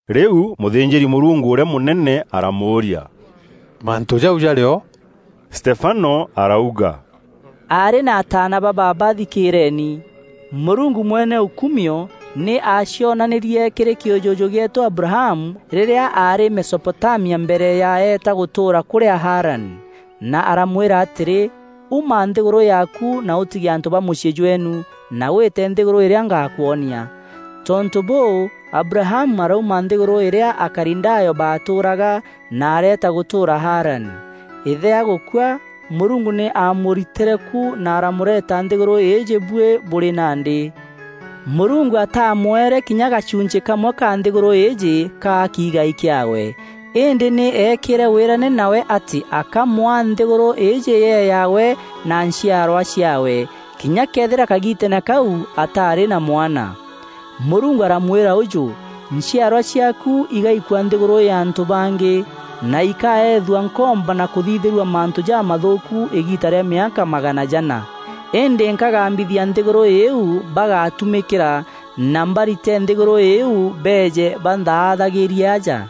Rîu mûthînjîri-Mûrungu ûrîa mûnene aramûûria, “Mantû jau jarî o?” Stefano arauga, “Aarî na ataana ba baaba, thikîîreeni! Mûrungu mwene ûkuumio, nî aacionanîrie kîrî kîûjûjû gîeetû Abrahamu rîrîa aarî Mesopotamia mbere ya eeta gûtûûra kûrîa Harani, na aramwîra atîrî, ‘Uma nthîgûrû yaaku na ûtige antû ba mûciî jweenu na wîte nthîgûrû îrîa ngakwonia!’ Tontû bûû, Abrahamu arauma nthîgûrû îrîa Akalidayo baatûûraga na areeta gûtûûra Harani. Îthe agûkua, Mûrungu nî aamûritîre ku na aramûreeta nthîgûrû îîjî buî bûrî nandî. Mûrungu aatamwere kinya gachunchî kamwe ka nthîgûrû îîjî, kaa kiigai kîaawe. Îndî nî eekîre wîrane nawe atî akamwaa nthîgûrû îîjî yee yaawe na nchiarwa ciaawe, kinya këethîra kagiiteene kau ataarî na mwana. Mûrungu aramwîra ûjû, ‘Nchiarwa ciaaku igaikua nthîgûrû ya antû bangî, na ikaethua nkombo na kûthithîrua mantû jamathûûku îgiita rîa mîaka magana jana. Îndî nkagambithia nthîgûrû îîu bagatumîkîra na mbarite nthîgûrû îîu beeje banthaathagîrie aja.’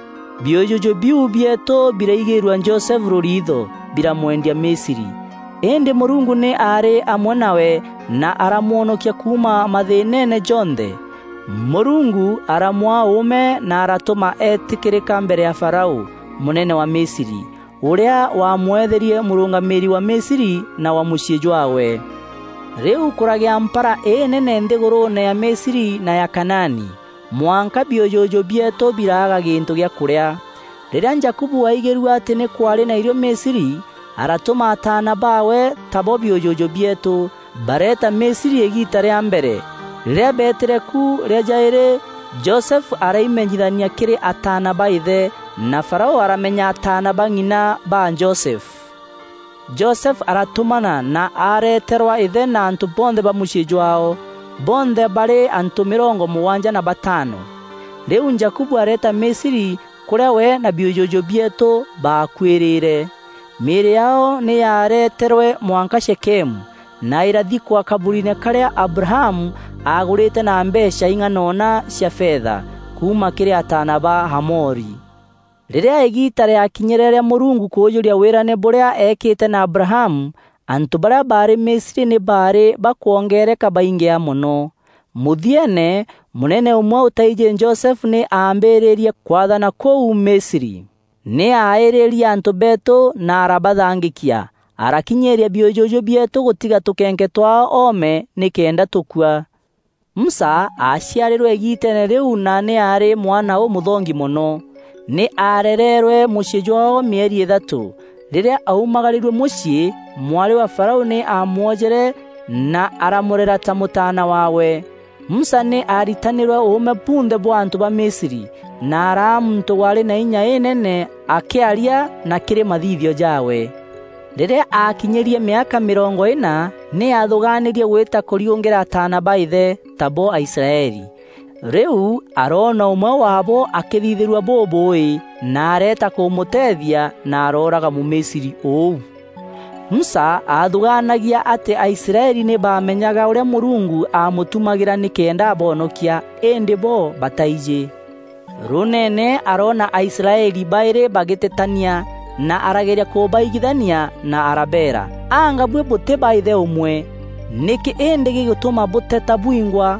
“Biûjûjû biu bieetû biraigîîrua Josefu rûriitho, biramwendia Misri. Îndî Mûrungu nî aarî amwe nawe na aramwonokia kuuma mathîînene jonthe. Mûrungu aramwaa ûûme na aratûma eetîkîrîka mbere ya Farao, mûnene wa Misri, ûrîa waamweetherie mûrûngamîîri wa Misri na wa mûciî jwaawe. Rîu kûragîa mpara înene nthîgûrûûne ya Misri na ya Kanaani, mwanka biûjûjû bieetû biraaga gîntû gîa kûrîa. Rîrîa Jakubu aaigîrue atî nî kwaarî na irio Misri, aratûma ataana baawe, tabo biûjûjû bieetû, bareeta Misri îgiita rîa mbere. Rîrîa beetîre ku rîa jaîrî, Josefu araimenyithania kîrî ataana ba îthe, na Farao aramenya ataana ba ng'ina ba Josefu. Josefu aratûmana na areeterwa îthe na antû bonthe ba mûciî jwaao. Bonthe baarî antû mîrongo mûgwanja na batano. Rîu Jakubu areeta Misri, kûrîa we na biûjûjû bieetû baakuîrîre. Mîîrî yaao nî yaareeterwe mwanka Shekemu, na îrathikwa kaburiine karîa Abrahamu aagûrîte na mbeecha ing'anona cia fetha, kuuma kîrî ataana ba Hamori. “Rîrîa îgiita rîakinyîre rîa Mûrungu kûûjûria wîrane bûrîa eekîte na Abrahamu, antû barîa baarî Misri nî baarî bakwongeereka baingîa mono. Mûthieene, mûnene ûmwe ûtaijî Josefu nî aambîrîrie kwaathana kûu Misri. Nî aaîrîrie antû beetû na arabathangîkia arakinyîîria biûjûjû bieetû gûtiga tûkenke twaao oome nîkenda tûkua. Musa aaciarîrwe igiitene rîu na nî aarî mwana ûmûthongi mono. Nî aarereerwe mûciî jwaao mîeri îthatû. Rîrîa aumagarîrue mûciî, mwarî wa Farao nî aamwojere na aramûrera ta mûtaana waawe. Musa nî aaritanîrwe ûûme bunthe bwa antû ba Misri, na araa muntû waarî na înya înene akîarîa na kîrî mathithio jaawe. “Rîrîa aakinyîrie mîaka mîrongo îna, nî aathûgaanîrie gwîta kûriûngîra ataana ba îthe, tabo Aisraeli. Rîu aroona ûmwe waabo akîthithîrua bûbûûî na areeta kûmûteethia na arooraga Mûmisri ûu. Musa aathûgaanagia atî Aisraeli nî baamenyaga ûrîa Mûrungu aamûtumagîra nîkenda aboonokia, îndî bo bataijî. Rûûneene aroona Aisraeli baîrî bagîtetania na arageria kûbaigithania na arabeera, ‘Anga buî bûtî ba îthe ûmwe. Nîkî îndî gîgûtûma bûteta bwingwa?’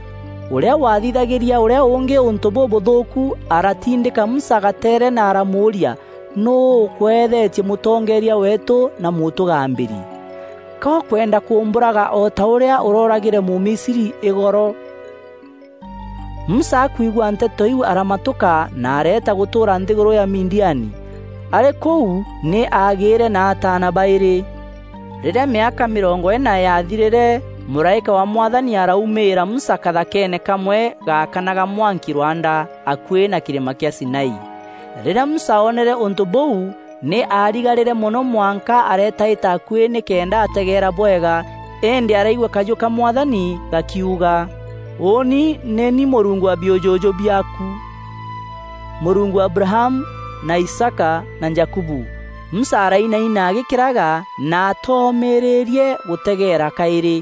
Ûrîa wathithagîria ûrîa ûngî ûntû bûbûthûûku aratindîka Musa gateere na aramûûria, ‘Nûû ûkweethetie mûtongeeria weetû na mûtûgambîri? Ka ûkwenda kûmbûraga o ta ûrîa ûrooragîre Mûmisri îgoro?’ Musa akwigua nteto iu aramatûka na areeta gûtûûra nthîgûrû ya Midiani. Arî kûû nî aagîîre na ataana baîrî. “Rîrîa mîaka mîrongo îna yaathirîre, mûraîka wa Mwathani araumîîra Musa kathakeene kamwe gaakanaga mwanki rwanda, akuî na kîrîma kîa Sinai. Rîrîa Musa oonere ûntû bûu nî aarigarîre mono mwanka areetaîta akuî nîkenda ategeera bwega îndî araigua kajû ka Mwathani gakiuga: ‘Ûûni nî ni Mûrungu wa biûjûjû biaaku, Mûrungu wa Abrahamu, na Isaaka na Jakubu!’ Musa arainaina agîkîraga na aatomîrîîrie gûtegeera kaîrî.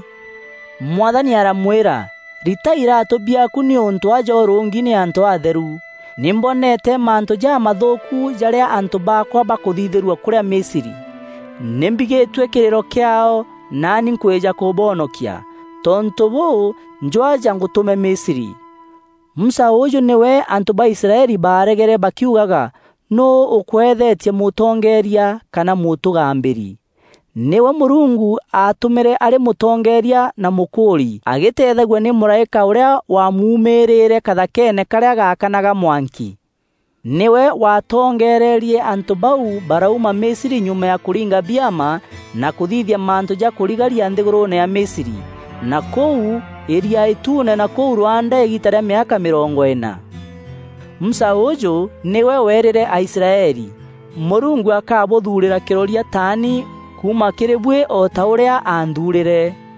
Mwathani aramwîra: ‘Rita iraatû biaaku nîûntû aja ûrûngi nî antû aatheru. Nî mboneete mantû jamathûûku jarîa antû baakwa bakûthithîrua kûrîa Misri. Nî mbigîtue kîrîro kîaao, naani nkwîja kûboonokia. Tontû bûû, njû aja ngûtûme Misri.’ “Musa ûûjû nîwe antû ba Israeli baaregere bakiugaga: ‘Nûû ûkweethetie mûtongeeria kana mûtûgambîri?’ Nîwe Mûrungu aatûmîre arî mûtongeeria na mûkûûri agîteethagua nî mûraîka ûrîa wamumîrîîre kathakeene karîa gaakanaga mwanki. Nîwe waatongeererie antû bau barauma Misri nyuma ya kûringa biama na kûthithia mantû ja kûrigaria nthîgûrûûne ya Misri, na kûu Îria Îtuune na kûu rwanda îgiita rîa mîaka mîrongo îna. Musa ûûjû nîwe weerîre Aisraeli: ‘Mûrungu akabûthuurîra kîroria taani kuuma kîrî buî o ta ûrîa aanthuurîre.’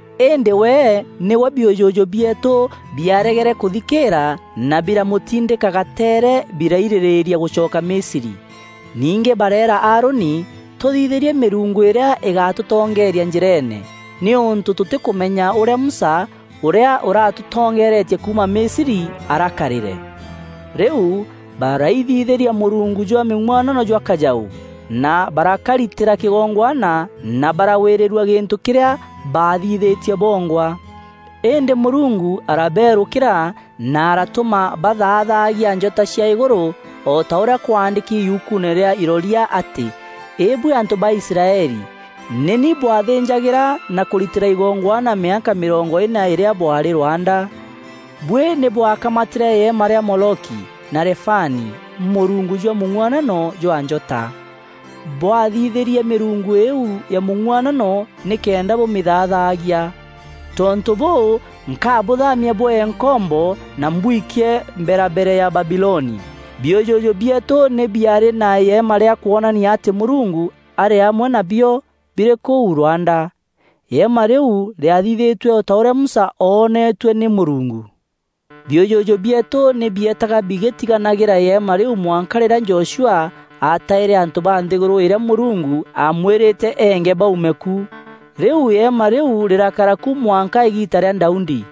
“Îndî we nîwe biûjûjû bieetû biaaregere kûthikîîra na biramûtindîka gateere birairîrîîria gûcoka Misri. Ningî bareera Aaroni: ‘Tûthithîrie mîrungu îrîa îgatûtongeeria njîreene, nîûntû tûtîkûmenya ûrîa Musa, ûrîa ûratûtongeeretie kuuma Misri arakarîre?’ Rîu baraithithîria mûrungu jwa mîng'uanano jwa kajaû, na barakaritîra kîgongwana na baragwîrîrua gîntû kîrîa baathithîtie bongwa. Îndî Mûrungu arabeerûkîra na aratûma bathaathagia njota cia îgûrû, o ta ûrîa kwaandîki yukuune rîa iroria atî: ‘Îbuî antû ba Israeli! Nî ni bwathînjagîra na kûritîra igongwana mîaka mîrongo îna îrîa bwaarî rwanda? Buî nî bwaakamatîre îema rîa Moloki, na Refani, mûrungu jwa mûng'uanano jwa njota. Bwathithîrie mîrungu îîu ya mûng'uanano nîkenda bûmîthaathagia. Tontû bûû, nkabûthamia bwee nkombo na mbwikie mberabere ya Babiloni.’ “Biûjûjû bieetû nî biaarî na îema rîa kwonania atî Mûrungu arî amwe nabio, birî kûu rwanda. Îema rîu rîathithîtue o ta ûrîa Musa ooneetue nî Mûrungu. Biûjûjû bieetû nî bieetaga bigîtiganagîra îema rîu mwanka rîrîa Joshua aataîre antû ba nthîgûrû îrîa Mûrungu aamwîrîte eenge baume ku. Rîu îema rîu rîrakara ku mwanka îgiita rîa Daudi.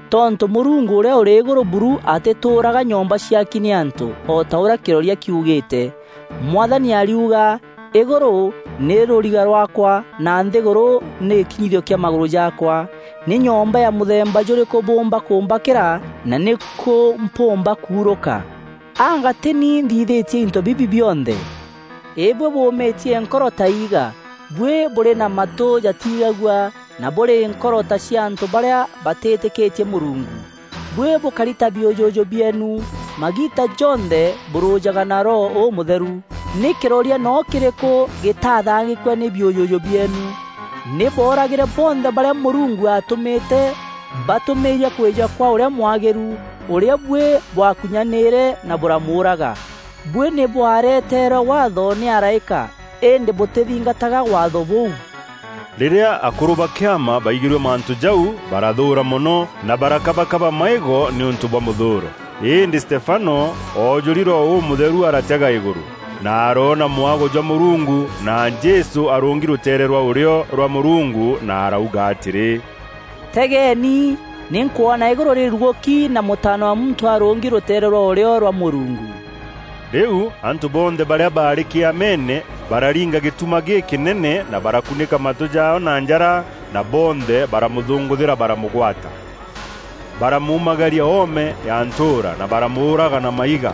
“Tontû Mûrungu Ûrîa Ûrî Îgûrû buru atîtûûraga nyomba ciaki nî antû, o ta ûrîa kîroria kiugîîte: ‘Mwathani ariuga: Îgûrû nî rûriga rwaakwa, na nthîgûrû nî gîkinyithio kîa magûrû jaakwa. Nî nyomba ya mûthemba jûrîkû bûûmba kûmbakîra, na nîkû mpûûmba kuurûka? Anga tî ni nthithîtie into bibi bionthe?’ “Îbuî bûûmîtie nkoro ta iiga! Buî bûrî na matû jatiigagua na bûrî nkoro ta cia antû barîa batîîtîkîtie Mûrungu! Buî bûkari ta biûjûjû bieenu, magiita jonthe bûrûjaga na Roho Ûmûtheru. Nî kîroria noo kîrîkû gîtaathangîkua nî biûjûjû bieenu? Nî booragîre bonthe barîa Mûrungu aatûmîte batûmîîria kwîja kwa Ûrîa Mwagîru, ûrîa buî bwakunyanîre na bûramûûraga. Buî nî bwareeterwe Waatho nî araîka îndî bûtîthingataga Waatho bûu.” Rîrîa akûrû ba Kîama baigîrue mantû jau, barathûûra mono na barakabakaba maîgo nîûntû bwa mûthûûro. Îndî Stefano, oojûri Roho Ûmûtheru aratega îgûrû, na aroona mwago jwa Mûrungu, na Jesû arûngi rûteere rwa ûrîo rwa Mûrungu na arauga atîrî, “Tegeeni! Nî nkwona îgûrû rîrugûki na Mûtaana wa Muntû arûngi rûteere rwa ûrîo rwa Mûrungu.” Rîu antû bonthe barîa baarî Kîameene, bararinga gîtuma gîkînene, na barakunîka matû jaao na njara na bonthe baramûthûngûthîra baramûgwata. Baramuumagaria oome ya ntûûra, na baramûûraga na maiga.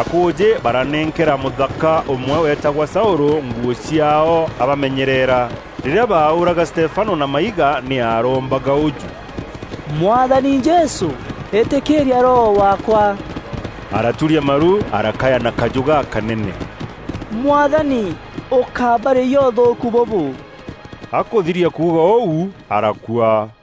Akûûjî baranenkera mûthaka ûmwe weetagwa Saûlû nguû ciaao abamenyerera. Rîrîa baaûûraga Stefano na maiga nî aarombaga ûjû, “Mwathani Jesû, îtîkîîria roho waakwa.” Araturia maru arakaya na kajû gakanene, “Mwathani, ûkábarîyia ûthûûku bûbû.” Akûthiria kuuga ûu, arakua.